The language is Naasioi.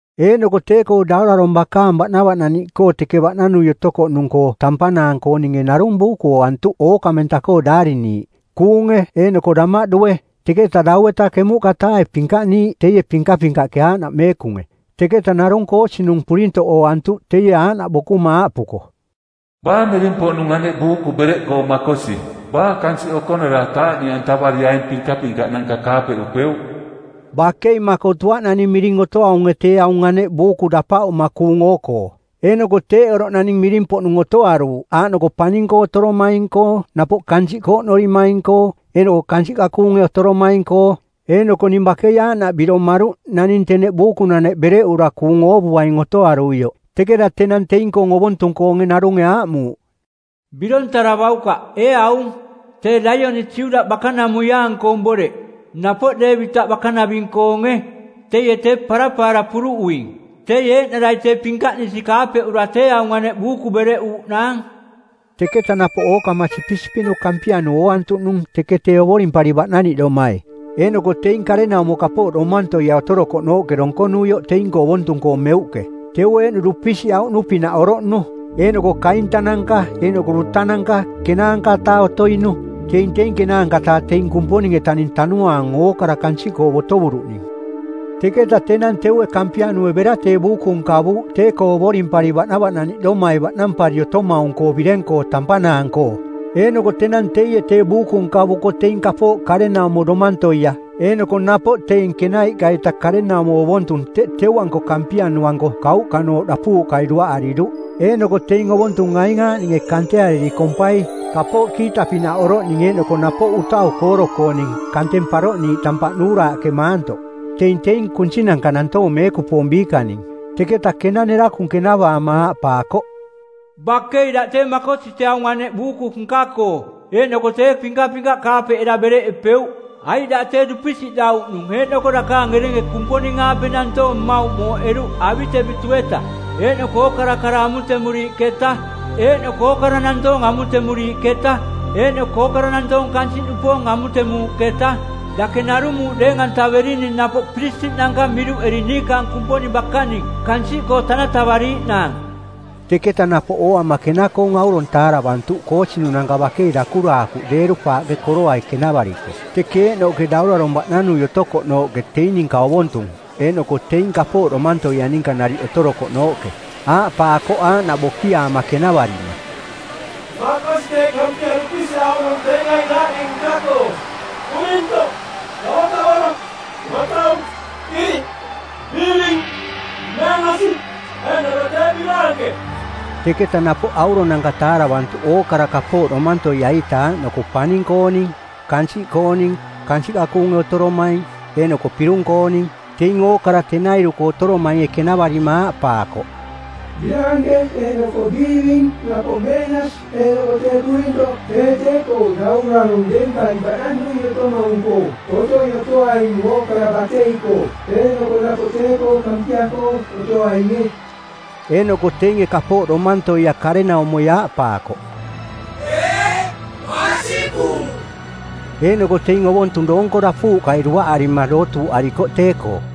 Eeꞌnoko tee-koo daurarong˜ bakaang baꞌnavaꞌnaniꞌkoo teke baꞌnanui otouꞌnung-koo tampanaang-koo ninge narung buuku ooantuꞌ ookamenta-koo daariniiꞌ, kuunge eeꞌnoko damaꞌdue, teketa dau-eta ˜kemuꞌka-taae pinkaꞌniiꞌ teie pinkapinkaꞌke, aaꞌnaꞌ meekunge. Teketa narung koosinung˜ purintoꞌ ooantuꞌ teie aaꞌnaꞌ bokuma aaꞌpuko, “Baa miring-poꞌnung aneꞌ buuku bereꞌkoo makosi? Baa kansiꞌ okonara taaꞌniꞌantavari aing pinkapinkaꞌnanka kaapeꞌupeuꞌ?” Bakei makotuaꞌ naning miring otoaunge tee aung aneꞌ buuku dapaꞌuma kuung oo-koo, eeꞌnoko teeꞌ oroꞌ naning miring-poꞌnung otoaruuꞌ aaꞌnoko paning-koo otoromaing-koo napoꞌ kansiꞌkoo oꞌnorimaing eeꞌnoko kansiꞌka kuunge otoromaing-koo. Eeꞌnoko ning bakei aaꞌnaꞌ biromaruꞌ naning teneꞌ buukunaneꞌ bereꞌura kuung oovuaing otoaruioꞌ. Teketa tenang teing-koong ovontung-koonge narunge aaꞌmuuꞌ, “Birontaravaukaꞌ, ee aung. Tee Laioni Juda bakanamuiaang-koong boreꞌ, napoꞌ Deevitaꞌ bakanaving-koonge, teie tee parapaara puruꞌuing. Teie eeꞌnarai tee pinkaꞌnisi kaapeꞌura tee aung aneꞌ buuku bereꞌuuꞌnaang.” Teketa napoꞌ ookama sipisipiꞌnu Kampianu ooantuꞌnung teke tee ovorimpari baꞌnaniꞌdomai, eeꞌnoko teing karenaumo kapooꞌ domantoia otorokoꞌnooꞌke donkonuioꞌ teing-koo ovontung-koo meuꞌke. Teu eeꞌnu dupisiꞌauꞌnu-pinaꞌ oroꞌnu. Eeꞌnoko kaintananka eeꞌnoko dutananka ˜kenaanka-taa otoinu, teing teing ˜kenaanka-taa teing Kumponing-etaning tanuaang ookara kansiꞌkoo botovuruꞌning. Teketa tenang teue Kampianue bera tee buuku nkavuuꞌ tee-koo ovorimpari baꞌnavaꞌnaniꞌdomai baꞌnampari otomaung-koo bireng-koo tampanaang-koo. Eeꞌnoko tenang teie tee buuku nkavuko teing kapooꞌ karenaumo domantoia eeꞌnoko napoꞌ teing kenaiꞌka-ita karenaumo ovontung teꞌ teu-anko Kampianu-anko kauꞌkanooꞌ dapuuꞌkai duaꞌariruꞌ. Eeꞌnoko teing ovontung aing aaꞌninge kanteariri kompai: kapooꞌ kiita-pinaꞌ oroꞌning eeꞌnoko napoꞌ utau kooro-kooning kanteng paroꞌniiꞌ tampaꞌ nuuraaꞌke maantoꞌ. Teing teing kunsinanka nantoong meekupoong biikaning. Teketa kena nerakung kenavaama aaꞌpaakoꞌ, “Bakei daꞌ tee makosi tee aung aneꞌ buuku nka-koo eeꞌnoko tee pinkapinkaꞌ kaapeꞌera bereꞌepeuꞌ, aiꞌ daꞌ tee dupisiꞌdauꞌnung eeꞌnoko dakaang erenge Kumponing-aape nantoong mmauꞌ mooꞌeruꞌ avi-tevitu-eta eeꞌnoko ookara kara amutemuriiꞌketa eeꞌnoko ookara nantoong amutemuriiꞌketa, eeꞌnoko ookara nantoong kansiꞌnupoong amutemuuꞌketa. Dake narung muuꞌ deeng-antaverining napoꞌ piristiꞌnanka miruꞌeri niikaang Kumponing bakaning kansiꞌkoo tanatavariiꞌnaang.” Teketa napoꞌ ooama kena-koong aurong taaravantuꞌ koosinunanka bakei dakuraakuꞌ deeru-paaꞌke koroai kenavariko teke eeꞌnooꞌke Daurarong˜ baꞌnanui otokoꞌnooꞌke teing ninka ovontung eeꞌnoko teing kapooꞌ domantoia ninka nariꞌ otorokoꞌnooꞌke. Aaꞌpaakoꞌ aaꞌnaꞌ bokiaama kenavarima, “Makosi tee Kampia dupisiꞌauꞌnung teing aing aaꞌning nka-koo: purintoꞌ, kavokavoro, matau, iriꞌ, biiving, meenasi, eeꞌnoko tee biraanke.” Teketa napoꞌ auronanka taaravantuꞌ ookara kapooꞌ domantoia-ita aaꞌnoko paning-kooning, kansiꞌkooning, kansiꞌka kuunge otoromaing eeꞌnoko pirung-kooning. Teing ookara tenairu-koo otoromainge kenavarima aaꞌpaakoꞌ, “Biraanke eeꞌnoko biiving napoꞌ meenasi eeꞌnoko tee purintoꞌ tee tee-koo Daurarong deempari baꞌnanui otomaung-koo otoi otoaing ookara batei-koo, eeꞌnoko napoꞌ tee-koo Kampia-koo otoainge.” Eeꞌnoko teinge kapooꞌ domantoia karenaumoi aaꞌpaakoꞌ, “Eeꞌ, masikung.” Eeꞌnoko teing ovontung doonko dapuuꞌkai duaꞌarima dootuuꞌarikoꞌ tee-koo.